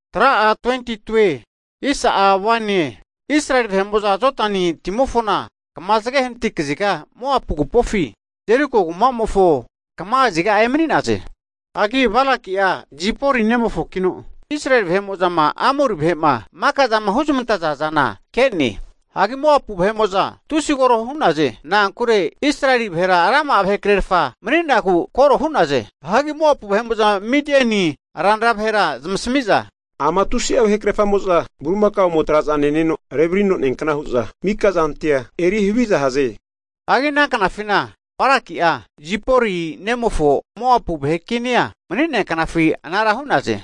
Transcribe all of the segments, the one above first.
Hagi Israeli vahe'mo'za Jodani timofona kama zage hanati kaziga Moapu agupofi, Jeriko kumamofo kama kaziga emani'naze. Hagi Balaki'a Zipori nemofokino Israeli vahe'mo'zama Amori vahe'ma maka'zama huzmantaza zana ke'ne. Hagi Moapu vahe'mo'za tusi koro hu'naze. Na'ankure Israeli vahera rama'a vahekrefa mani'nagu koro hu'naze. Hagi Moapu vahe'mo'za Midieni ranra vahera zamasami'za, ama tusi'a vahe krefamo'za bulimakaomo traza neno revrino neankna hu'za mika zantia eri havizahaze. Hagi ana knafina Zipori nemofo Balaki'a Moapu vahe kinia mani'nea knafi anara hu'naze.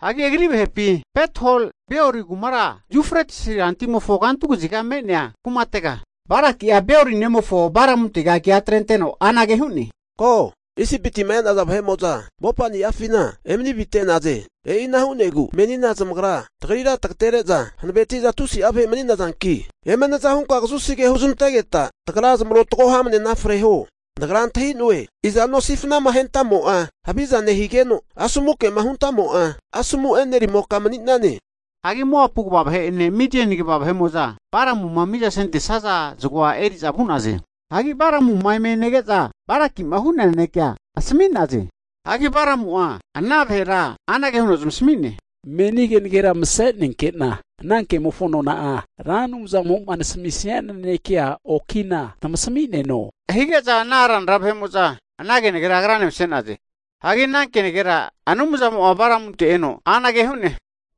Hagi agri vahepi Pethor Beori kumara Yufretis rantimofo kantu kaziga me'nea kumatega, Balaki'a Beori nomofo Balamuntega kea atrenteno anage hu'ne, ko, Isipitima e'naza vahe'mo'za mopani'afina emani avite'naze. E'ina hu'negu menina zamagra tagrira tagatere'za hanaveti'za tusi'a vahe mani'nazanki, eme naza hunka kazusi ke huzmantegeta, tagra zamarotago hamnena freho. Nagra antahi'noe, izano sifanama ahentamo'a haviza nehigeno, asomu kema huntamo'a, asomu e'nerimoka mani'nane. Hagi Moapu kva vahe'ene Midiani kva vahe'mo'za Balamuma miza sentesaza zagoa eri'za vu'naze. Hagi Balamuma eme nege'za Balaki'ma hu'nea nanekea asami'naze. Hagi Balamu'a ana vahera anage huno zamasami'ne, meni kenagera mase'nenkena ana kemofo nona'a, Ra Anumzamo'ma nasami'nia nanekea oki'na tamasami'neno, hige'za ana ranra vahe'mo'za ana kenagera agrane mase'naze. Hagi ana kenagera Anumzamo'a Balamunte eno anage hu'ne.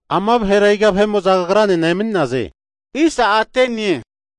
Ama vahera iga vahe'mo'za kagranena emani'naze?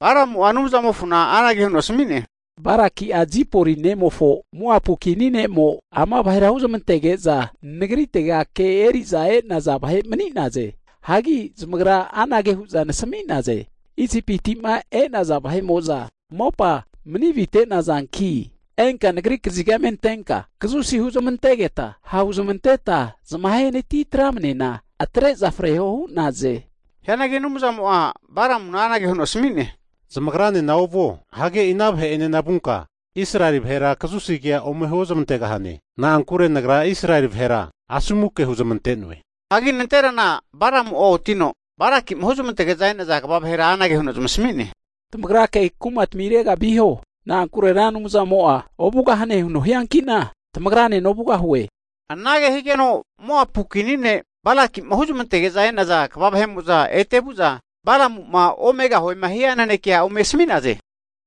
Balamu'a Anumzamofona anage huno asami'ne, Balaki'a Zipori nemofo Moapu kini ne'mo ama vahera huzamantege'za nagritega ke eri'za e'naza vahe mani'naze. Hagi zamagra anage hu'za nasami'naze, Isipiti'ma e'naza vahe'mo'za mopa mani avite'nazanki enka nagri kaziga eme antenka kazusi huzmantegeta ha'huzamanteta zamahe natitramnena atre'za freho hu'naze. Hianagi Anumzamo'a Balamuna anage huno asami'ne, Zamagranena ovuo. Hagi e'i ana vahe'enena vunka Israeli vahera kazusi kea ome huo zmantegahane. Na'ankure nagra Israeli vahera asomu ke huzamante'noe. Hagi nanterana Balamu'a otino Balakima huzmantege'za e'naza kva vahera anage huno zamasami'ne, tamagrake kumatamirega viho. Na'ankure Ra Anumzamo'a ovugahane huno hianki'na tamagranena ovugahue. Anage higeno Moapu kini ne' Balaki'ma huzmantege'za e'naza kva vahe'mo'za ete vu'za Balamu'ma omegahuema hia nanekea Balakina ome asmi'naze.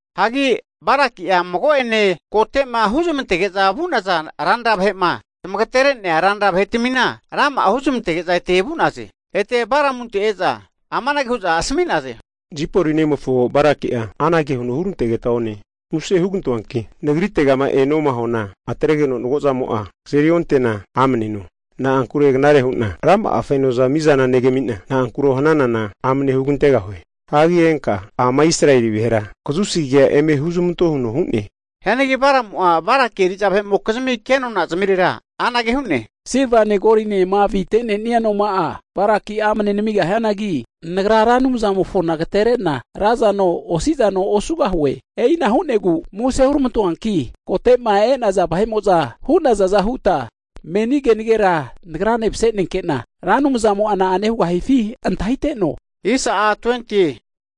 Hagi Balaki'a mago'ene kote'ma huzamantege'za vu'naza ranra vahe'ma zmagatere'nea ranra vahetami rama'a huzmantage'za ete vu'naze. Ete Balamunte e'za, amanage hu'za asmi'naze, Zipori nemofo Balaki'a anage huno hurantegeta one, muse hugantoanki nagritegama enoma huana atregeno mago'zamo'a kazerionte'na amne eno. Na'ankure knare hu'na rama'a fenoza mizana negami'na, na'ankuro hananana amane hugantegahue. Hagi enka ama Israeli vahera kazusi kea eme huzamanto huno hu'ne. Hianagi Balamu'a Balaki eri'za vahe'mokizmi kenona zamirera anage hu'ne, Silvane golinena avite'nenia noma'a Balaki'a amne namigahianagi, nagra Ra Anumzanimofona agatere'na razano osi'zano osugahue. E'ina hu'negu muse huramantoanki kote'ma e'naza vahe'mo'za hu'nazaza huta meni kenagera nagrane mase'nenkena Ra Anumzamo'a na'ane hugahifi antahiteno.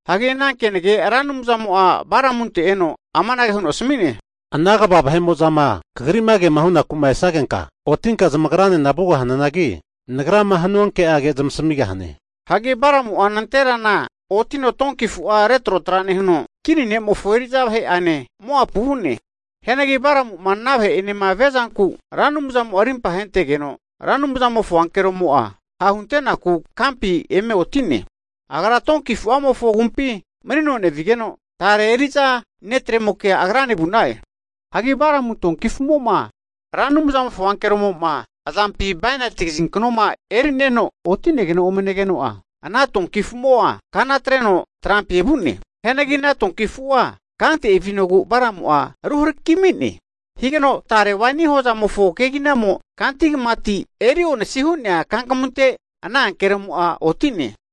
Hagi ana kenage Ra Anumzamo'a Balamunte eno amanage huno asmi'ne, Ana kva vahe'mo'zama kagri'ma kema hunaku esagenka, otinka zamagrane vugahananagi, Nagrama hanua ke'age zmasamigahane. Hagi Balamu'a nanterana otino donki afu'a retrotra nehuno, kini ne'mofo eri'za vahe'ane Moapu vu'ne. Hianagi Balamu'ma ana vahe'enema viazanku Ra Anumzamo'a rimpa ahentegeno, Ra Anumzamofo ankeromo'a ha'hunte'naku kampi eme oti'ne. Agra donki afu'amofo agumpi manino nevigeno, tare eri'za netremokea agrane vu'na'e. Hagi Balamu donki afu'mo'ma Ra Anumzamofo ankeromo'ma azampi bainati kazinknoma eri'neno otinegeno ome negeno'a, ana donki afu'mo'a kana atreno trampi evu'ne. Hianagi ana donki afu'a kante evinogu Balamu'a ruharakimi'ne. Higeno tare waini hozamofo keginamo kanti kamati eri onasi hu'nea kankamunte, ana ankeromo'a oti'ne.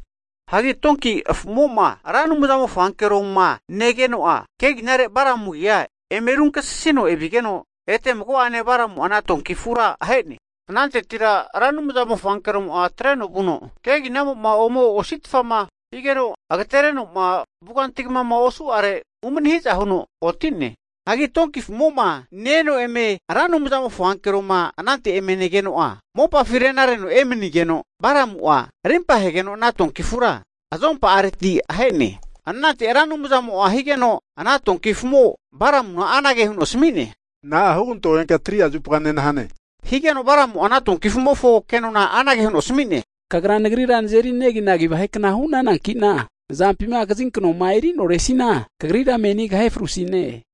Hagi donki afumo'ma Ra Anumzamofo ankeroma negeno'a, keginare Balamu agia eme runkasisino evigeno ete mago'ane Balamu'a ana donki afura ahe'ne. Anantetira Ra Anumzamofo ankeromo'a atreno vuno keginagamo'ma ome ositfama higeno agaterenoma vuganti kamama osu'are umani hiza huno oti'ne. Hagi donki afumo'ma Ra Anumzamofo ankeroma anante eme negeno'a, mopafi renareno emanigeno, Balamu'a rimpa ahegeno ana donki afura azompa'areti ahe'ne. Anante Ra Anumzamo'a higeno ana donki afu'mofo Balamuna anage huno asami'ne, Na'a hugantogenka 3'a zupa nenahane? Higeno Balamu'a ana donki afu'mofo kenona anage huno asmi'ne, Kagra nagrira nazeri neginagi vahe kna hu'nananki'na nazampima kazinknoma eri'noresina kagrira meni kahe frusine.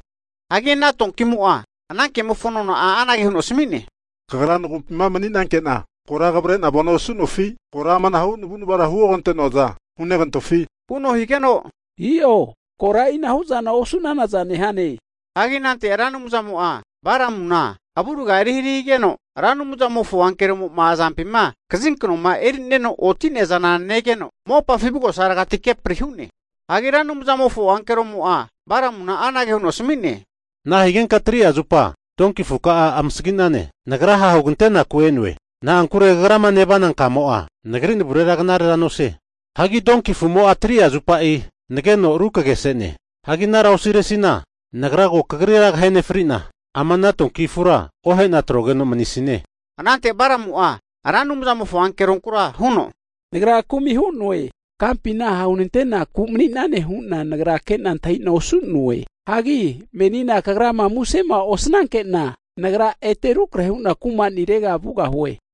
Hagi ana donkimo'a ana kemofo nona'a anage huno asami'ne, kagra nagumpima maninke'na kora kavre'na vano osu'nofi? Kora amanahu navu'navara hugante'noaza hunegantofi? Huno higeno, i'o kora e'inahu'zana osu'nanaza nehane. Hagi anante Ra Anumzamo'a Balamuna avurga eri hari higeno, Ra Anumzamofo ankeromo'ma azampi kazinknoma eri'neno oti'nea zana negeno, mopafi avugosaregati kepri hu'ne. Hagi Ra Anumzamofo ankeromo'a Balamuna anage huno asami'ne, Nahigenka 3'a zupa donki afuka'a amasagi'nane? Nagra ha'hugante'naku e'noe. Na'ankure kagrama nevana kamo'a, Nagri navurera knarera nosie. Hagi donki afumo'a 3'a zupa nageno rukagese'ne. Hagi anara osiresina nagra ko kagrira kahe nefri'na, ama ana donki afura ohe'na atrogeno manisine. Anante Balamu'a Ra Anumzamofo ankeronkura huno, Nagra kumi hu'noe. Kampina ha hunantenaku mani'nane hu'na nagra kena antahi'na osu'noe. Hagi menina kagrama musema osnanke'na, nagra ete rukrahe hu'na kumanirega vugahue.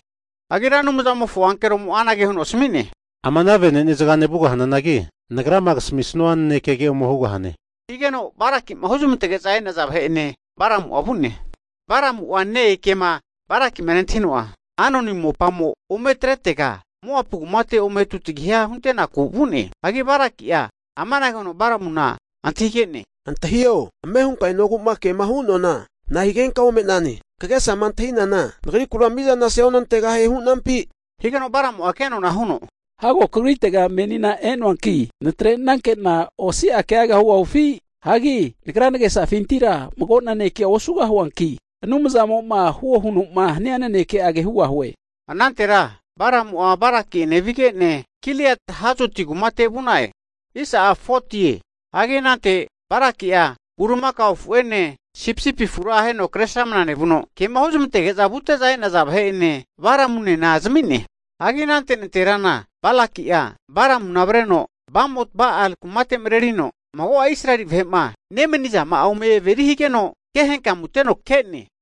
Hagi Ra Anumzamofo ankeromo'a anage huno asmi'ne, Ama ana venenezagane vugahananagi, nagrama kasamisua nanekege ome hugahane. Higeno Balakima huzmantege'za e'naza vahe'ene Balamu'a vu'ne. Balamu'a ne-e kema Balaki'ma nentahino'a, Arnoni mopamo ometretega Moapu kumate ome tutagiha hunte'naku vu'ne. Hagi Balaki'a amanage huno Balamuna antahige'ne, antahio, ame hunka enogu'ma kema hu'noana nahigenka ome'nane? Kagesama antahinana nagrikura mizana seonantegahie hu'nampi? Higeno Balamu'a kenona huno, hago kagritega menina e'noanki natrenanke'na osia kegaga hugahufi? Hagi nagra nagesafintira mago nanekea osugahuanki, Anumzamo'ma huo huno'ma hania naneke'age hugahue. Anante Balamu'a Balaki'ene vige'ne, Kiriat Huzoti kumate vu'na'e. Hagi anante Balaki'a bulimakao afu'ene sipisipi afura aheno kresramna nevuno, ke'ma huzmantege'za vute'za e'naza vahe'ene Balamunena zami'ne. Hagi anante nanterana Balaki'a Balamuna avreno Bamot-Ba-al kumate mrerino mago'a Israeli vahe'ma nemanizama'a ome averi higeno, ke henkamuteno ke'ne.